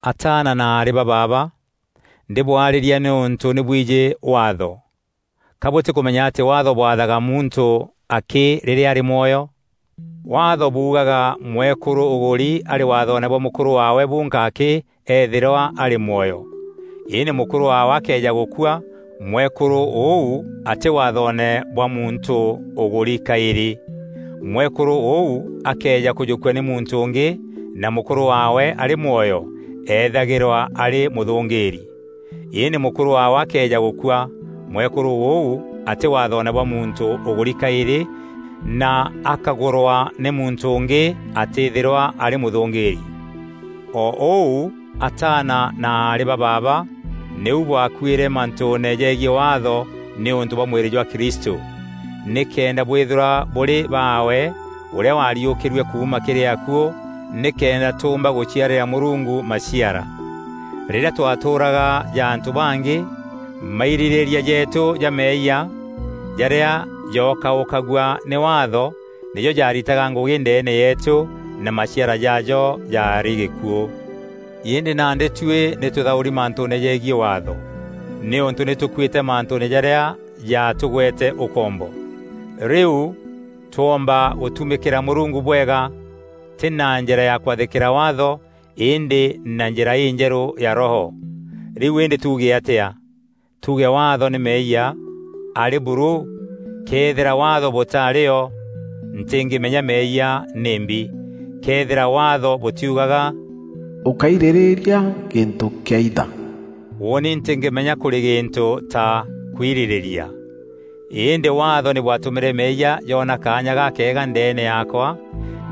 Ataana na aarî ba baaba, ndîbwarîria nîûntû nî bwijî Waatho! Ka bûtîkûmenya atî Waatho bwathaga muntû akî rîrîa arî mwoyo? Waatho buugaga mwekûrû ûgûri arî waathoone bwa mûkûrû waawe bûnka akî eethîrwa arî mwoyo. Îndî mûkûrû waawe akëeja gûkua mwekûrû ûu atî waathoone bwa muntû ûgûri kaîrî. Mwekûrû ûu akëeja kûjûkua nî muntû ûngî na mûkûrû waawe arî mwoyo, eethagîrwa arî mûthûngîîri. Îndî mûkûrû waawe akëeja gûkua, mwekûrû ûu atî waathoone bwa muntû ûgûri kaîrî na akägûrwa nî muntû ûngî atîîthîrwa arî mûthûngîîri. O ûu ataana na aarî ba baaba nîu bwakuîre mantûûne jegiî Waatho nîûntû bwa mwîrî jwa Kristû, nîkenda bwîthîrwa bûrî baawe, ûrîa waariûkîrue kuuma kîrî akuû nîkenda tûûmba gûciarîra Mûrungu maciara. Rîrîa twatûûraga ja antû bangî, mairîrîîria jeetû ja meeyia, jarîa jookaûkagua nî Waatho, nîjo jaaritaga ngûgî ndeene yeetû na maciara jaajo jaarî gîkuû. Îndî nandî tuî nî tûthaûri mantûûne jegiî Waatho, nîûntû nî tûkuîte mantûûne jarîa jaatûgwete ûkombo. Rîu twomba gûtumîkîra Mûrungu bwega, tî na njîra ya kwathîkîra Waatho îndî na njîra înjerû ya Roho. Rîu îndî tuuge atîa? Tuuge Waatho nî meeyia? Arî buru! Këethîra Waatho bûtaarî o, ntîngîmenya meeyia nîmbi. Këethîra Waatho bûtîugaga “Ûkáirîrîria gîntû kîaitha,” ûûni ntîngîmenya kûrî gîntû ta kwirîrîria. Îndî Waatho nî bwatûmîre meeyia joona kaanya gakeega ndeene yaakwa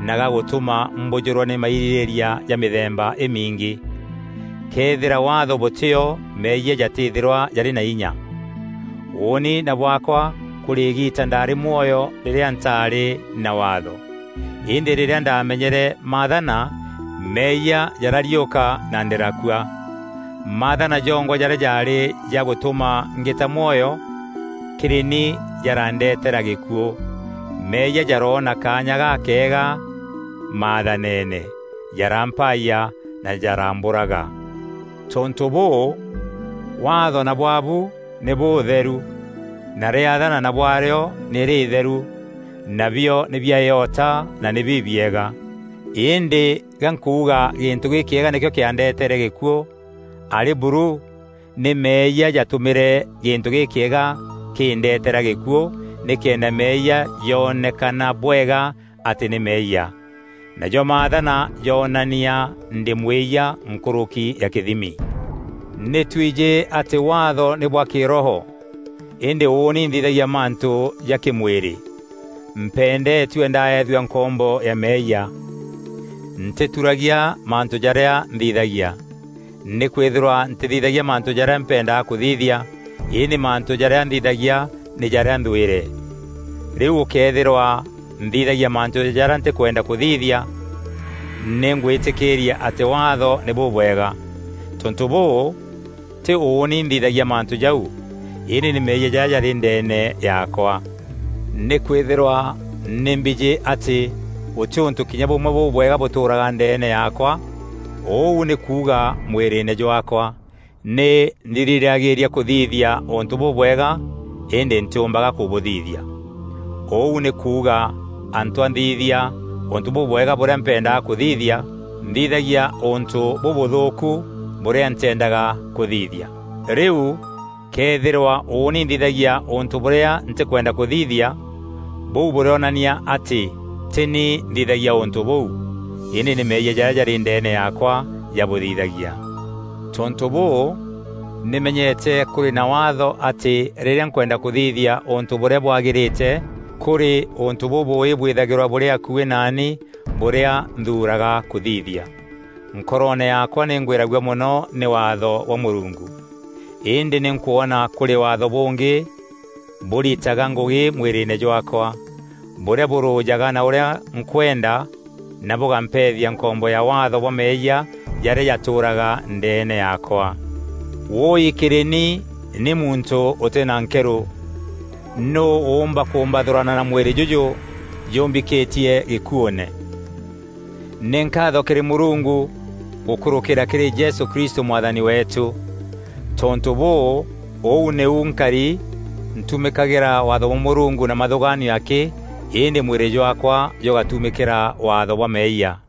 na gagûtûma mbûjûrwa nî mairîrîîria ja mîthemba îmingî. Këethîra Waatho bûtîo meeyia jatîîthîrwa jarî na inya. Ûûni na bwaakwa kûrî îgiita ndaarî mwoyo rîrîa ntaarî na Waatho, îndî rîrîa ndaamenyere maathana, meeyia jarariûka na ndîrakua. Maathana jongwa jarîa jaarî ja gûtûma ngîta mwoyo, kîrî ni jarandetera gîkuû. Meeyia jaroona kaanya gakeega maathaneene, jarampayia na jarambûraga. Tontû bûû, Waatho na bwaabu nî bûûtheru, na rîathana na bwarîo nî rîîtheru, nabio nî bia îota na nî bibiega. Îndî ga nkuuga gîntû gîkîega nîkîo kîandeeteere gîkuû? Arî buru! Nî meeyia jaatûmîîre gîntû gîkîega kîndeteera gîkuû nîkenda meeyia jonekana bwega atî nî meeyia. Najo maathana joonania ndî mwîyia nkûrûki ya kîthimi. Nî twijî atî Waatho nî bwa kîroho; îndî ûûni nthithagia mantû ja kî-mwîrî, mpendetue ndaethua nkombo ya meeyia. Ntîturagia mantû jarîa nthithagia. Nîkwîthîrwa ntîthithagia mantû jarîa mpendaga kûthithia; îndî mantû jarîa nthithagia nî jarîa nthwîre. Rîu gûkëethîrwa nthithagia mantû jarîa ntîkwenda kûthithia, nî ngwîtîkîîria atî Waatho nî bûbwega. Tontû bûû, tî ûûni nthithagia mantû jau, îndî nî meeyia jarîa jarî ndeene yaakwa. Nîkwîthîrwa nî mbijî atî gûtî ûntû kinya bûmwe bûbwega bûtûûraga ndeene yaakwa, ûu nî kuuga mwîrîîne jwaakwa. Nî ndirîragîîria kûthithia ûntû bûbwega, îndî ntîûmbaga kûbûthithia. Ûu nî kuuga, antû a nthithia ûntû bûbwega bûrîa mpendaga kûthithia, nthithagia ûntû bûbûthûûku bûrîa ntîendaga kûthithia. Rîu këethîrwa ûûni nthithagia ûntû bûrîa ntîkwenda kûthithia, bûu bûrîonania atî tî ni nthithagia ûntû bûu, îndî nî meeyia jarîa jarî ndeene yaakwa jabûthithagia. Tontû bûû, nî menyete kûrî na Waatho atî rîrîa nkwenda kûthithia ûntû bûrîa bwagîrîte, kûrî ûntû bûbûûî bwîthagîrwa bûrî akuî naanî bûrîa nthuuraga kûthithia. Nkoroone yaakwa nî ngwîragua mono nî Waatho bwa Mûrungu. Îndî nî nkwona kûrî Waatho bûngî bûritaga ngûgî mwîrîîne jwaakwa, bûrîa bûrûjaga na ûrîa nkwenda na bûgampethia nkombo ya waatho bwa meeyia jarîa jatûûraga ndeene yaakwa. Wûûi kîrî ni, ni muntû ûtî na nkerû! Nûû ûûmba kûmbathûrana na mwîrî jûjû jûmbikîtie gîkuûne? Nî nkaatho kîrî Mûrungu gûkûrûkîîra kîrî Jesû Kristû Mwathani weetû. Tontû bûû, ûu nîu nkari; ntumîkagîra Waatho bwa Mûrungu na mathûgaanio akî îndî mwîrî jwaakwa jûgatûmîkîra waatho bwa meeyia.